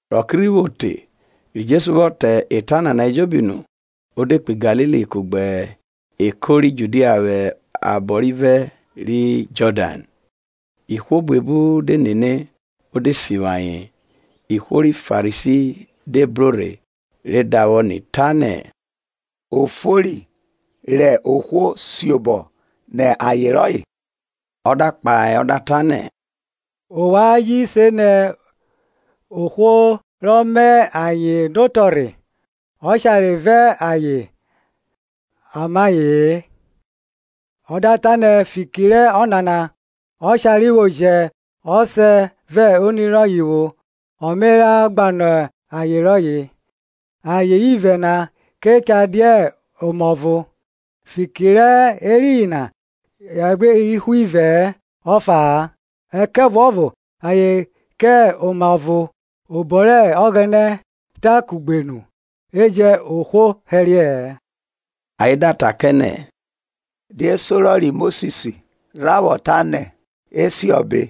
Rẹ ọke rhi vwo te, ri Jesu vwọ ta eta nana ejobi nu, o de kpo Galili, kugbe eko ri Judia vwẹ abọ rivẹ ri Jọdan. Ihwo buebu de nene; o de sivwi ayen. Ihwo ri Farisi de bro rhe re davwọ ni ta nẹ, Ọ fori rẹ ohwo siobọ nẹ aye rọye? Ọ da kpahe ọ da ta nẹ, Ovwan ji se nẹ ohwo rọ ma ayen notọrhe ọshare vẹ aye a ma ayen? Ọ da ta nẹ, Fiki rẹ ọnana ọshare vwo jẹ ọsẹ vẹ oni rọye vwo ọ me ra gbanọ aye rọye, ayen ivẹ na ke cha dia oma ọvo. Fiki rẹ eriyin na ayen gbe hẹ ihwo ivẹ ọfa, ẹkẹvuọvo ayen kẹ oma ọvo. Obo rẹ Ọgbẹnẹ tan kugbe nu, e jẹn ohwo hẹriẹ-ẹ. Ayen da ta kẹ nẹ, Die sorọ ri Mosis rha vwọ ta nẹ e siọbe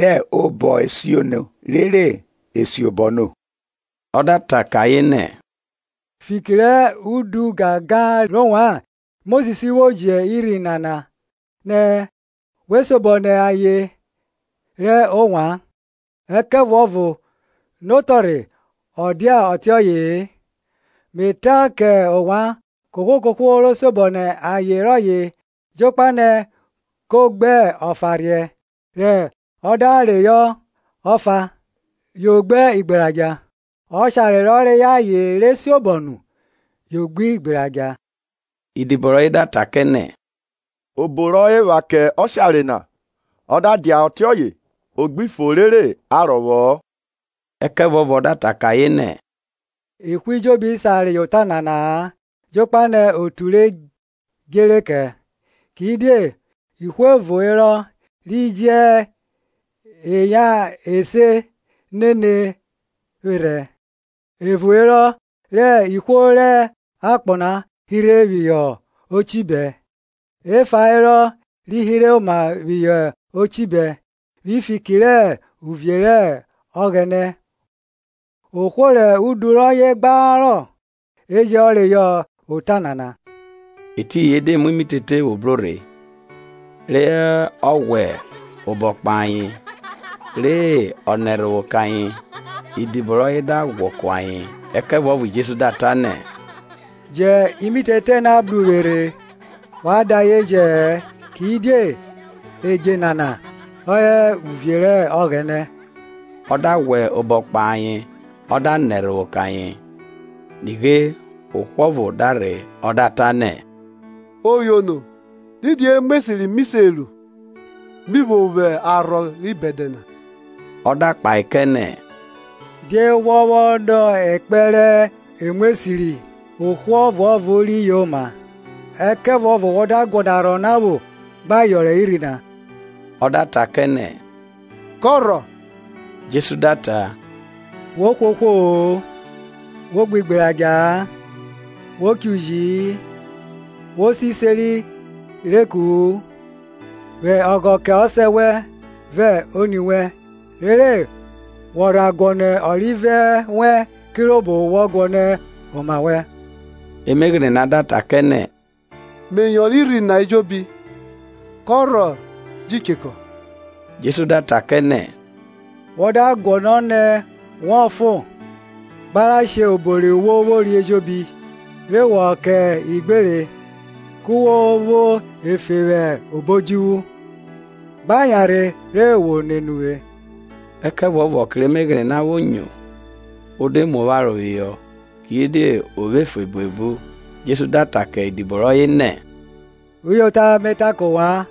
rẹ obọ esiono rere e siobọ no? Ọ da ta kẹ ayen nẹ, fiki rẹ udu ọgangan rẹ ovwan Mosis vwo ji urhi na nẹ we siobọ nẹ aye rẹ ovwan; ẹkẹvuọvo notọrhe ọ dia ọtiọye-e. Me ta kẹ ovwan, kohwo kohwo ro siobọ nẹ ayen rọye, jokpa nẹ ko gbe ọfaurhiẹ, rẹ ọ da reyọ ọfa, yo gbe igberadja; ọshare rọ reyọ aye re siobọ nu, yo gbe igberadja. Idibo rọye da ta kẹ nẹ, Obo rọ epha kẹ ọshare na, ọ da dia ọtiọye o gbi fo rere a rọvwọ-ọ. Ẹkẹvuọvo ọ da ta kẹ ayen nẹ, Ihwo ejobi sa reyọ ota nana-a, jokpa nẹ otu re djere kẹ. Kidie ihwo evo herọ ri jẹ eya ese nene vwerhẹ. Evo herọ rẹ ihwo rẹ akpọ hirhe phihọ ochibẹ, efa herọ ri hirhe oma phihọ ochibẹ vwi fiki rẹ uvie rẹ Ọghẹnẹ. Ohwo rẹ udu rọye gbarọ e jẹ reyọ ota nana. Etiyin e de mu imitete vwo bro rhe, re ọ ghwẹ obọ kpahe ayen, re ọ nẹ ẹrhovwo kẹ ayen. Idibo rọye da ghwọ ku ayen. Ẹkẹvuọvo Jesu da ta nẹ, Jẹn imitete na bru uvwe rhe, wa da ayen jẹ-ẹ kidie edje nana hẹ uvie rẹ Ọghẹnẹ. Ọ da ghwẹ obọ kpahe ayen ọ da nẹ ẹrhovwo kẹ ayen. Nighe, ohwo ọvo da rhe o da ta nẹ, Oyono didi emu esiri mi se ru, mi vwo vwo arhọ ri bẹdẹ na? Ọ da kpahe kẹ nẹ, Die wọ vwọ nọ ekpẹn rẹ emu esiri? Ohwo ọvuọvo ri yoma: ẹkẹvuọvo wọ da guọnọ arhọ na vwo gba yọnrọn irhi na. Ọ da ta kẹ nẹ, kọ rhọ? Jesu da ta, wo hwe ohwo-o, wo gbe igberadja-a, Wo cho uji-i, Wo se iseri rẹ eku-u, Vwẹ ọghọ kẹ ọsẹ wẹn vẹ oni wẹn rere wọ rha guọnọ ọrivẹ wẹ kirobo wọ guọnọ oma wẹn. Emeghene na da ta kẹ nẹ, Me yọnrọn irhi na ejobi. Kọ rhọ ji chekọ? Jesu da ta kẹ nẹ, Wọ da guọnọ nẹ wọ fon, gba ra she obo ri wo vwori ejobi, re wọ vwẹ ayen kẹ ivwiogbere, ku wo vwo efe vwẹ obo odjuvwu, gba yanrhe ri wo nene uvwe. Ẹkẹvuọvo ọke rẹ emeghene na vwo nyo, o de mu opharo phihọ: kidie o vwo efe buebu. Jesu da ta ke idibo rọye nẹ, Uyota me ta kẹ ovwan,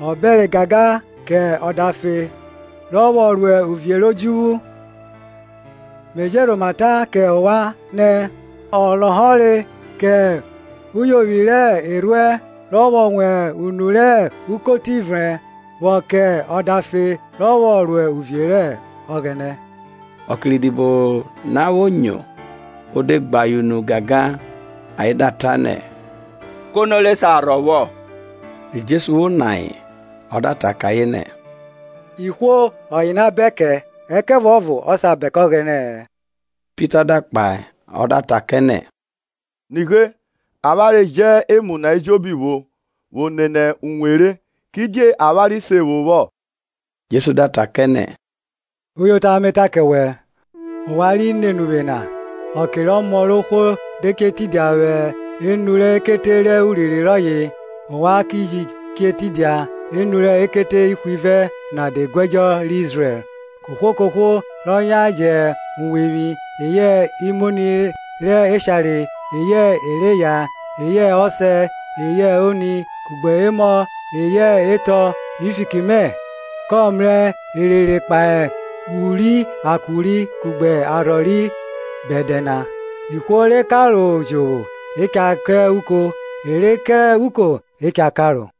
Ọ bẹre gangan kẹ ọdafe rọ vwọ ro uvie rẹ odjuvwu. Me je rhoma ta kẹ ovwan nẹ, Ọ lọhọre kẹ uyovwi rẹ erhuẹn rọ vwọ wan unu rẹ ukoti vrẹn, vwọ kẹ ọdafe rọ vwọ ro uvie rẹ Ọghẹnẹ. Ọke rẹ idibo na vwo nyo, o de gbe ayen unu gangan, ayen da ta nẹ, kono re sa rhọ vwo? Ri Jesu vwo ni ayen ọ da ta kẹ ayen nẹ, Ihwo ọye ona bẹn kẹ; ẹkẹvuọvo ọ sa bẹn kẹ Ọghẹnẹ-ẹ. Pita da kpahe ọ da ta kẹ nẹ, Nighe, avwanre jẹ emu na ejobi vwo vwo nene uwe re. Kidie avwanre se vwo? Jesu da ta kẹ nẹ, Uyota me ta kẹ wẹ, Ovwan ri nene uvwe na, ọke rẹ Ọmọ rẹ ohwo de che tidia vwẹ enu rẹ ekete rẹ urinrin rọye, ovwan ki ji che tidia enu rẹ ekete ihwivẹ na de guẹdjo rẹ Izrẹl. Kohwo kohwo rọ yan jẹ uwevwi, eyẹ imoni rẹ eshare, eyẹ e re eya, eyẹ ọsẹ, eyẹ oni, kugbe emọ eyẹ etọ vwi fiki mẹ, kọ mrẹ erere kpahe uri akuri kugbe arhọ ri bẹdẹ na. Ihwo re karo jovwo e cha ka uko, e re ka uko e cha karo.